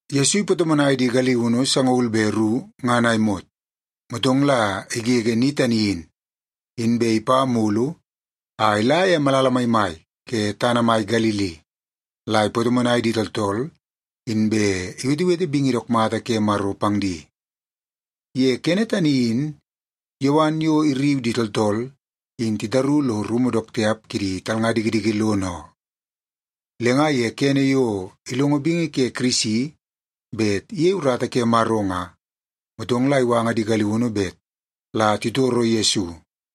Yesu ipatomonai di galiunu sangaul be ru ngan a imot, motong la igege ni tani in, inbe ipa mulu a ila ye malala maimai ke tana mai Galili la ipatomonai di tooltool, inbe iwetewete bingi dook mata ke Maro pang di. Ye kene tani in Yowan yo irriu di tooltool in titaru lo rumu dook tiap kidi talnga dikidiki lono oo. Le nga ye kene yo ilongo bingi ke Kirisi bet iyei urata ke Maro nga, motong la iwanga di galiunu bet la titoro Yesu.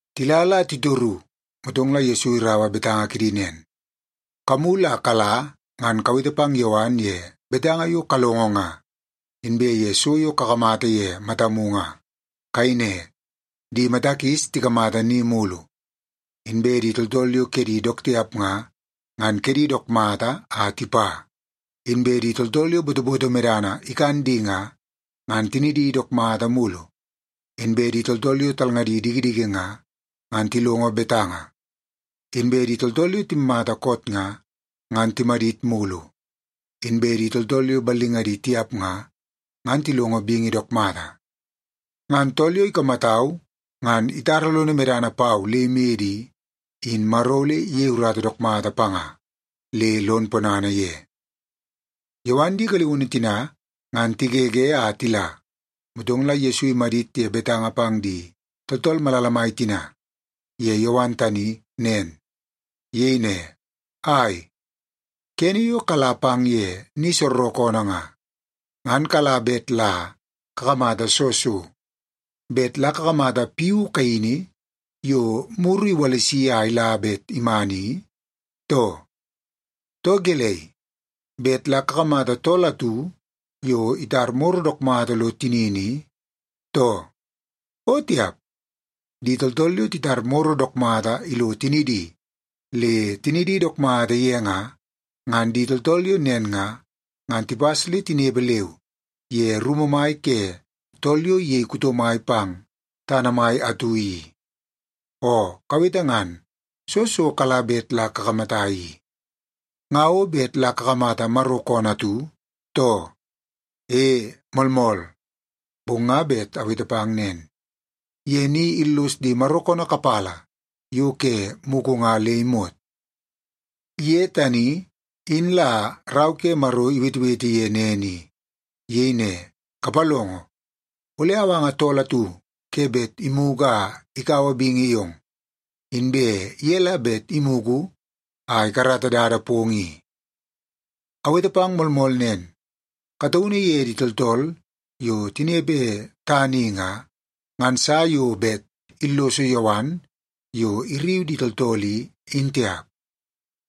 Tila la titoru, motong la Yesu iraua betanga kidi nen, “Kamulu a kala ngan kawete pang Yowan ye betanga yo kalongo nga, inbe ye so yo kakamata ye matamu nga. Kayei ne, ‘Di mata kis tikamata ni mulu; inbe di tooltool yo kedi dook tiap nga, ngan kedi dook mata a tipa; inbe di tooltool yo botoboto medana ikan di nga, ngan tinidi dook mata mulu; inbe di tooltool yo talngadi dikidiki nga, ngan tilongo betanga; inbe di tooltool yo timmata koot nga, ngan timadit mulu; inbe di tooltool yo ballingadi tiap nga, ngan tilongo bingi dook mata.’ Ngan tool yo ikamatau ngan itara lono medana pau le imede i, in Maro ole iyei urata dook mata panga le lon ponana ye.” Yowan di galiunu tina ngan tigege a tila, motong la Yesu imadit ye betanga pang di tooltool malala mai tina ye Yowan tani nen. Iyei ne, “Ai, kene yo kala pang ye ni soorookoonoo nga, ngan kala bet la kakamata soo so? Bet la kakamata piu kaini yo muru iwalisi a ila bet iman i, too? Too gelei, bet la kakamata tool atu yo itar moro dook mata lo tinini i, too? O tiap! Di tooltool yo titar moro dook mata ilo tinidi le tinidi dook mata ye nga, ngan di tooltool yo nen nga, ngan tipas le tinepe leu ye rumu mai ke tool yo iyei kuto mai pang tana mai atu i. Oo kawete ngan, soo so kala bet la kakamata i? Nga o bet la kakamata Maro koonoo atu, too? E, moolmool. Bong nga bet awete pang nen, ye ni illos di Maro koonoo kapala yo ke mugu nga le imot. Ye tani in la Rau ke Maro iwetewete ye nen i. Iyei ne, ‘Kapalongo! Ole awanga tool atu ke bet imugu a ikaua bingi yong. Inbe ye la bet imugu a ikarata dada pong i.’ Awete pang moolmool nen, kataunu ye di tooltool yo tinepe tana i nga, ngan sa yo bet illoso Yowan yo irriu di tooltool i, in tiap.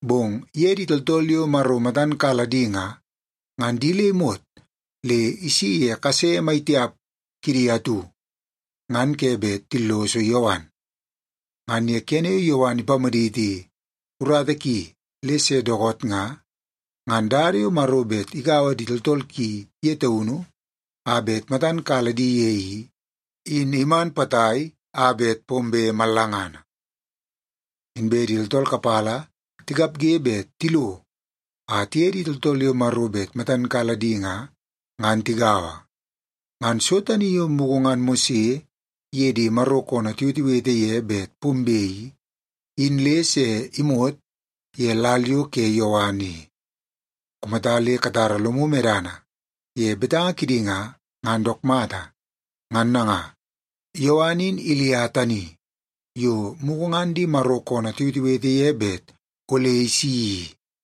Bong ye di tooltool yo Maro matan kala di nga, ngan di le imot le isi ye kase maitiap kidi atu, ngan ke bet tilloso Yowan. Ngan ye kene yo Yowan ipamaditi urata ki le se dookoot nga, ngan dada yo Maro bet igaua di tooltool ki ye taunu a bet matan kala di ye i, in iman potai a bet pombe mallangana. Inbe di tooltool kapala tikapge bet tilo a tiye di tooltool yo Maro bet matan kala di nga, ngan tigaua. Ngan so tani yo mugu ngan Mose iye di Maro koonoo tiwetewete ye bet pombe i, in le se imot ye lal yo ke Yowan i. Kumata le katara lomu medana ye betanga kidi nga, ngan dook mata. Ngan nanga, Yowan in Ilia tani yo mugu ngan di Maro koonoo tiwetewete ye bet ole isi i.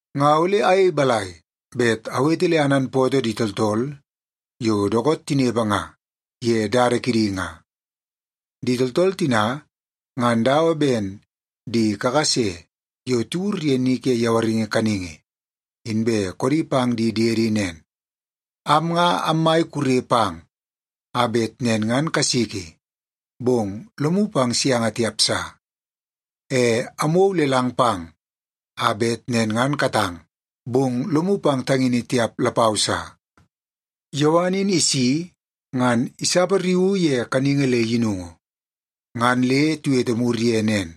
“Nga ole ayei balai bet awete le ananpootoo di tooltool yo dookoot tinepe nga ye dada kidi nga? Di tooltool tina, ngan dawa ben di kakase yo tiwur ye ni ke yawaringi kaningi, inbe koodi pang di diedi nen, ‘Am nga ammai kure pang a bet nen ngan kasiki, bong lomu pang sianga tiap sa. E amwou lelang pang a bet nen ngan katang, bong lomu pang tangini tiap lapau sa.’ Yowan in isi ngan isapariuu ye kaningi le yinungu. Ngan le tiwete mur ye nen,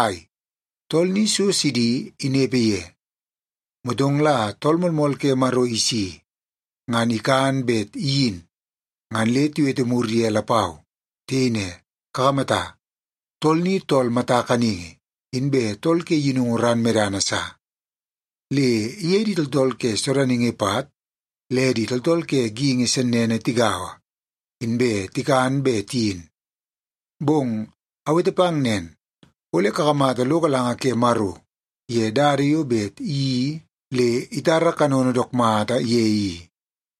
‘Ai, tool ni so sidi inepe ye.’ Motong la Tool Moolmool ke Maro isi, ngan ikan bet iyin ngan le tiwete mur ye lapau. Tiyei ne, ‘Kakamata, tool ni tool mata kaningi inbe tool ke yinungu ran medana sa. Le iye di tooltool ke sodaningi pat le tooltool ke geingi sennene tigaua, inbe tikan be tiyin.’ Bong awete pang nen, ole kakamata lo galanga ke Maro ye dada yo bet iyeii le itara kanono dook mata ye i.”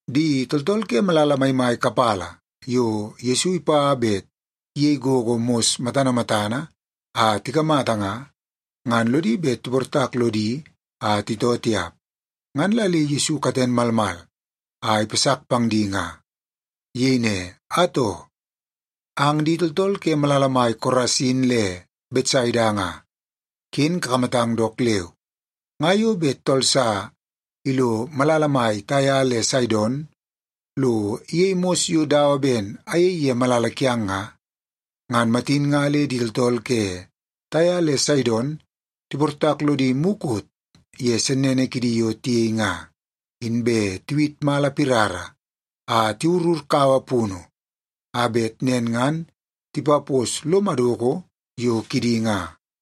Di tooltool ke malala maimai kapala yo Yesu ipa bet iyei gogo mos matana matana a tikamata nga, ngan lodi bet tiportak lodi a titoo tiap. Ngan la le Yesu katen malmal a ipasak pang di nga. Iyei ne, “Atoo, ang di tooltool ke malala mai Korasin le Betsaida nga, ken kakamatang dook leu. Nga yo bet tool sa ilo malala mai Taia le Saidon lo iyei mos yo dawa ben ayei ye malala kiang nga, ngan matin nga le di tooltool ke Taia le Saidon tiportak lodi mukot ye sennene kidi yo tiyei nga, inbe tiwit mala pirara a tiwurur kaua punu a bet nen ngan tipapos lo madoko yo kidi nga.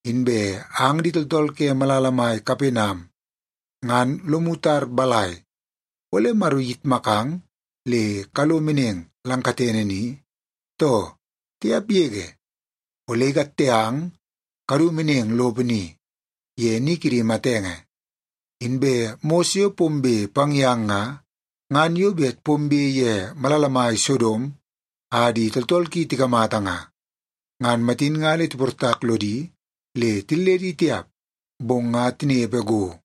Inbe ang di tooltool ke malala mai Kapenam ngan lomu tar balai, ole Maro iyitmakang le kalo meneng lang katene ni, too? Tiap yege! Ole ikatte ang kadu meneng lopo ni, ye ni kidi matenge. Inbe mos yo pombe pang yang nga, ngan yo bet pombe ye malala mai Sodom a di tooltool ki tikamata nga, ngan matin nga tiportak lodi le tilledi tiap, bong nga tinepe go.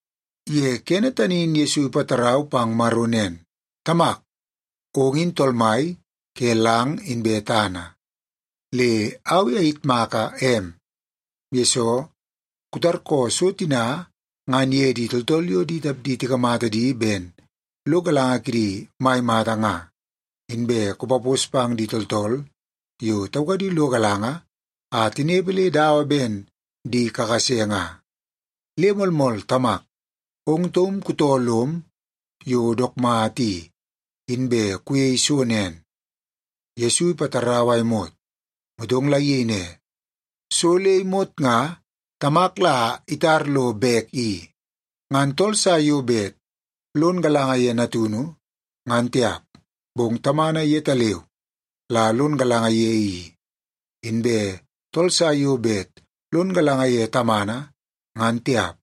Ye kene tani in Yesu ipatarau pang Maro nen, “Tamak, ong in Tool Mai ke lang inbe tana. Le au i ayitmaka em, yesoo kutarkoo so tina ngan ye di tooltool yo di tapdi tikamata di ben lo galanga kidi mai mata nga, inbe kupapos pang di tooltool yo taukadi lo galanga a tinepe le dawa ben di kakase nga. Le moolmool Tamak, ong taum kutoo lom yo dook mata i, inbe kuyei so nen.” Yesu ipatarau a imot, motong la iyei ne, “So le imot nga Tamak la itar lo bek i. Ngan tool sa yo bet lon galanga ye Natunu, ngan tiap, bong Tamana yetaleu la lon galanga ye i. Inbe tool sa yo bet lon galanga ye Tamana, ngan tiap,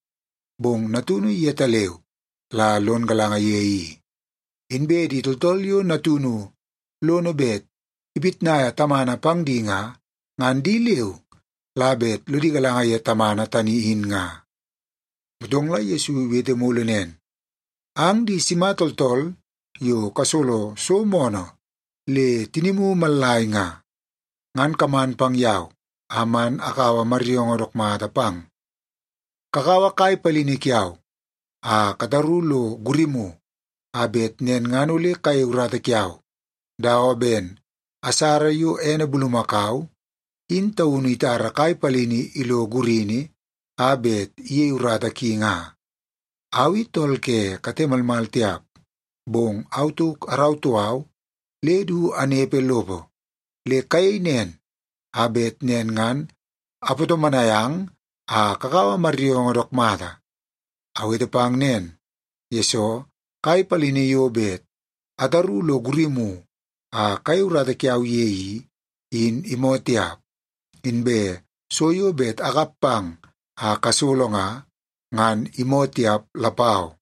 bong Natunu yetaleu la lon galanga ye i. Inbe di tooltool yo Natunu lono bet ipitnaia Tamana pang di nga, ngan di leu la bet lodi galanga ye Tamana tani in nga.” Motong la Yesu iwete mulu nen, “Ang di sima tooltool yo kasolo so moonoo le tinimu mallai nga, ngan kaman pang yau a man akaua maryoongoo dook mata pang. Kakaua kai palini kiau a kataru lo gurimu a bet nen ngan ole kayei urata kiau, dawa ben asara yo ene bulumakau in taunu itara kai palini ilo gurini a bet iyei urata ki nga. Au i tool ke kate malmal tiap, bong au tauk arautoo au le du anepe lopo. Le kayei nen, a bet nen ngan apatomonai ang a kakaua maryoongoo dook mata. Awete pang nen, yesoo kai palini yo bet ataru lo gurimu a kayei urata kiau ye i, in imoo tiap. Inbe so yo bet akap pang a kasolo nga, ngan imoo tiap lapau.”